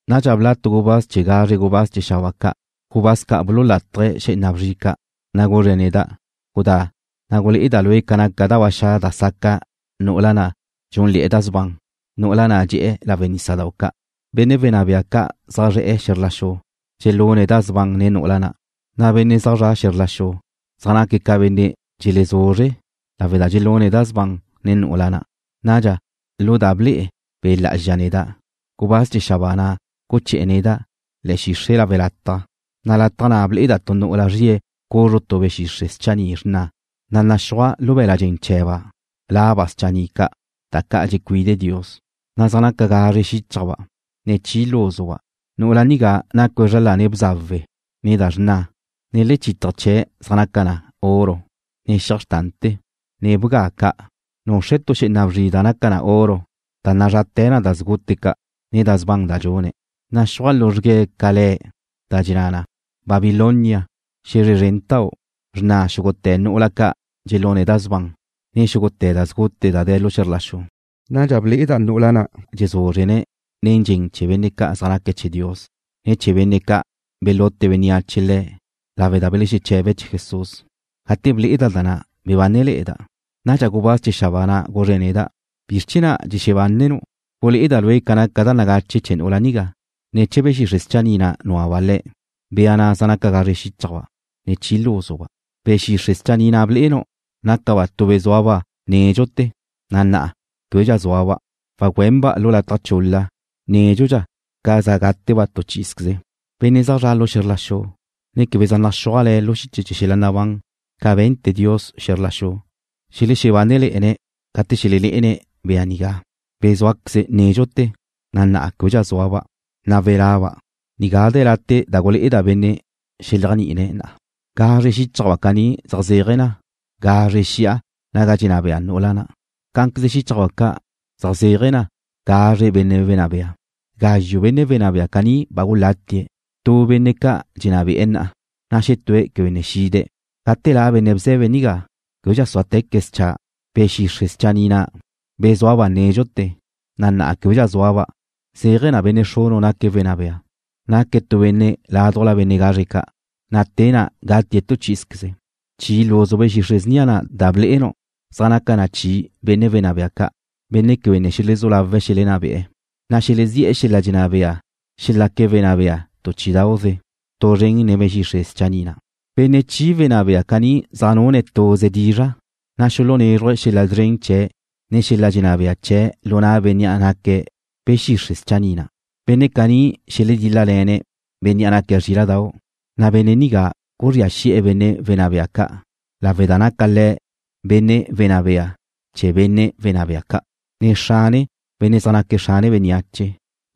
Nadxa bla' tu gubáz chee̱ gazre gubáz chee̱ xabáa ca', gubáz ca' bululátaje̱' xé'ena bzri ca', na' guzre̱' neda': ―Gudá, na' gulé'eda' lue' ca naca da ba xa' da saca' nu'ula na' dxúnle̱'e̱ da sban, nu'ula na' dxe'e̱ lawe' nísadau' ca'. Benne' wenná bea ca' zaj zre̱'e̱ xe̱zr la xu dxelune̱' da sban nen nu'ula na', na' benne' zaj zre̱'e̱ xe̱zr la xu zaj naque̱' ca benne' dxelezuzre' lawe' da dxelune̱' da sban nen nu'ula na'. Nadxa, lu da ble'e Be' Lá'azxa neda', gubáz chee̱ xabáa na' guché̱'e̱ neda' le̱'e̱ xixre' lawe' lataj, na' lataj na' ble'eda' tu nu'ula zrie̱' cuzru tu be̱ xixre' schanni' xrna, na' zaj naxúaj lu be̱la' dxen chee̱ba' laba' schanni' ca', da ca' dxecuide Dios, na' zaj naca gazre xíchajba', ne chi lúzuba'. Nu'ula nigá nacue̱' zra lane̱' bzawe, ne da xrna, na' lechítaje̱ chee̱' zaj naca na oro, ne xiaj xrtante̱, ne bga ca'. Nuxre̱' tu xé'ena bzri da naca na oro da nazrate̱ na da sgute ca', ne da sban da dxune̱'. Naxúaj luzrgue̱' ca le̱', da dxenná na: Babilonia, Xe̱zre Szrentau', Xrna' Xúgute̱ Nu'ula Ca' Dxelune̱' Da Sban, ne Xúgute̱ Da Sgute Da De̱ Xe̱zr La Xu. Nadxa ble'eda' nu'ula na' dxezúzrene̱' nen dxen chee̱ benne' ca' zaj naque̱' chee̱ Dios, ne chee̱ benne' ca' belute bénneache le̱' lawe' da belexeche̱be̱' chee̱ Jesús. Gate ble'eda' da na', bebánele̱'e̱da'. Nadxa gubáz chee̱ xabáa na' guzre̱' neda': ―¿Bizr chee̱ na' dxebánenu'? Gulé'eda' lue' ca naca da nagache chee̱ nu'ula nigá, ne chee̱ be̱ xixre' schanni' na' núaba' le̱', bea na' zaj napa gazre xíchajba', ne chi lúzuba'. Be̱ xixre' schanni' na' blé'enu', nácaba' tu be̱ zúaba' nédxute̱, na na'a québedxa zúaba'. Wagüenba' lu lataj chul-la nédxudxa ca za gáteba' tu chí'izqueze. Benne' zaj zra' xe̱zr la xu, ne quebe zaj naxúaj le̱' lu xiche chee̱ xel-la' nabán ca be̱nte̱ Dios xe̱zr la xu, xelexebánele̱'e̱ne̱' gate xelelé'ene̱' bea nigá, be̱ zúaqueze nédxute̱, na' na'a québedxa zúaba', na' wela'ba'. ’Nigá de̱ late' da gulé'eda' benne' xeléajni'ine̱' na. Gazre xíchajba' caní zaj zéaje̱ na gazre xi'a naga dxenná bea nu'ula na'. Cá'anqueze xíchajba' ca' zaj zéaje̱ na gazre benne' wenná bea. Gazxu' benne' wenná bea caní ba gulatie̱'. Tu benne' ca' dxenná be'e̱ na'a, na' xetue̱' quebe ne xide̱'. Gate la' benne' bze̱be nigá, québedxa súateque̱' scha'. Be̱ xixre' schanni' na', be̱ zúaba' nédxute̱, na' na'a québedxa zúaba', zéaje̱ na benne' xrunu' naque̱' benne' wenná bea. Naque̱' tu benne' ládujla benne' gazre ca', na' te na' gatie̱' tu chí'izqueze. ’Chi lúzu be̱ xixre' snia na' da blé'enu' zaj naca na chi benne' wenná bea ca', benne' quebe ne xelezú lawe̱' xelenná be'e̱, na' xelezí'e̱ xel-la' dxenná bea xelaque̱' wenná bea tu chí'idau'ze tu zren nen be̱ xixre' schanni' na'. Benne' chi wenná bea caní zaj nune̱' tuze dizra', na' xulunézruje̱' xel-la' szren chee̱', ne xel-la' dxenná bea chee̱' lu na' bénnea' naque̱' be̱ xixre' schanni' na'. Benne' caní xeledíl-lale̱ne' Bénnea' naque̱' Zríla'dau', na' Benne' nigá guzría xi'e̱ benne' wenná bea ca', lawe' da naca Le̱' Benne' Wenná Bea chee̱ benne' wenná bea ca', ne Xrane benne' zaj naque̱' xrane bénneache,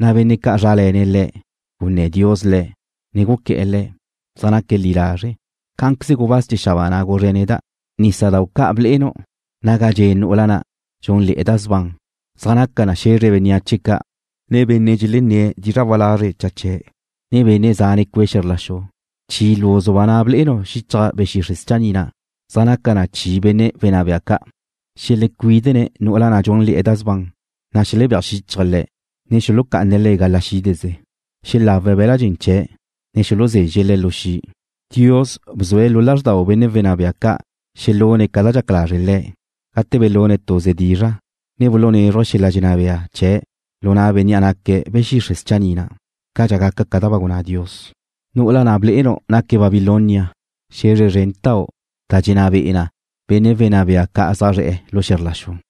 na' benne' ca' zrále̱ne̱' Le̱', gunné̱ Dios le̱', ne guqué̱'e̱ le̱', na' zaj naque̱' li lazre'. Cá'anqueze gubáz chee̱ xabáa na' guzre̱' neda': ―Nísadau' ca' blé'enu', naga dxe' nu'ula na' dxúnle̱'e̱ da sban, zaj naca na xe̱zre bénneache ca', ne benne' dxelenné̱' dizra' walazre' cha chee̱', ne benne' zane cue' xe̱zr la xu. Chi lúzuba' na' blé'enu' xichaj be̱ xixre' schanni' na', da zaj naca na chi benne' wenná bea ca', xelecuídene̱' nu'ula na' dxúnle̱'e̱ da sban, na' xelebéaj xíchaje̱' le̱', ne xulucá'ane̱' le̱' gala xídeze. Xelawe̱' be̱la' dxen chee̱', ne xuluzezxe̱' le̱' lu xi'. Dios bzue̱' lu lázrdau benne' wenná bea ca' xelune̱' ca da dxaca lazre' Le̱', gate belune̱' tuze dizra', ne bulunézruje̱' xel-la' dxenná bea chee̱' lu na' bénnea' naque̱' be̱ xixre' schanni' na', cadxa gaca ca da ba gunná Dios. Nu'ula na' blé'enu' naque̱' Babilonia, xe̱zre zrentau' na' dxenná be'e na benne' wenná bea ca' zaj zre̱'e̱ xe̱zr la xu.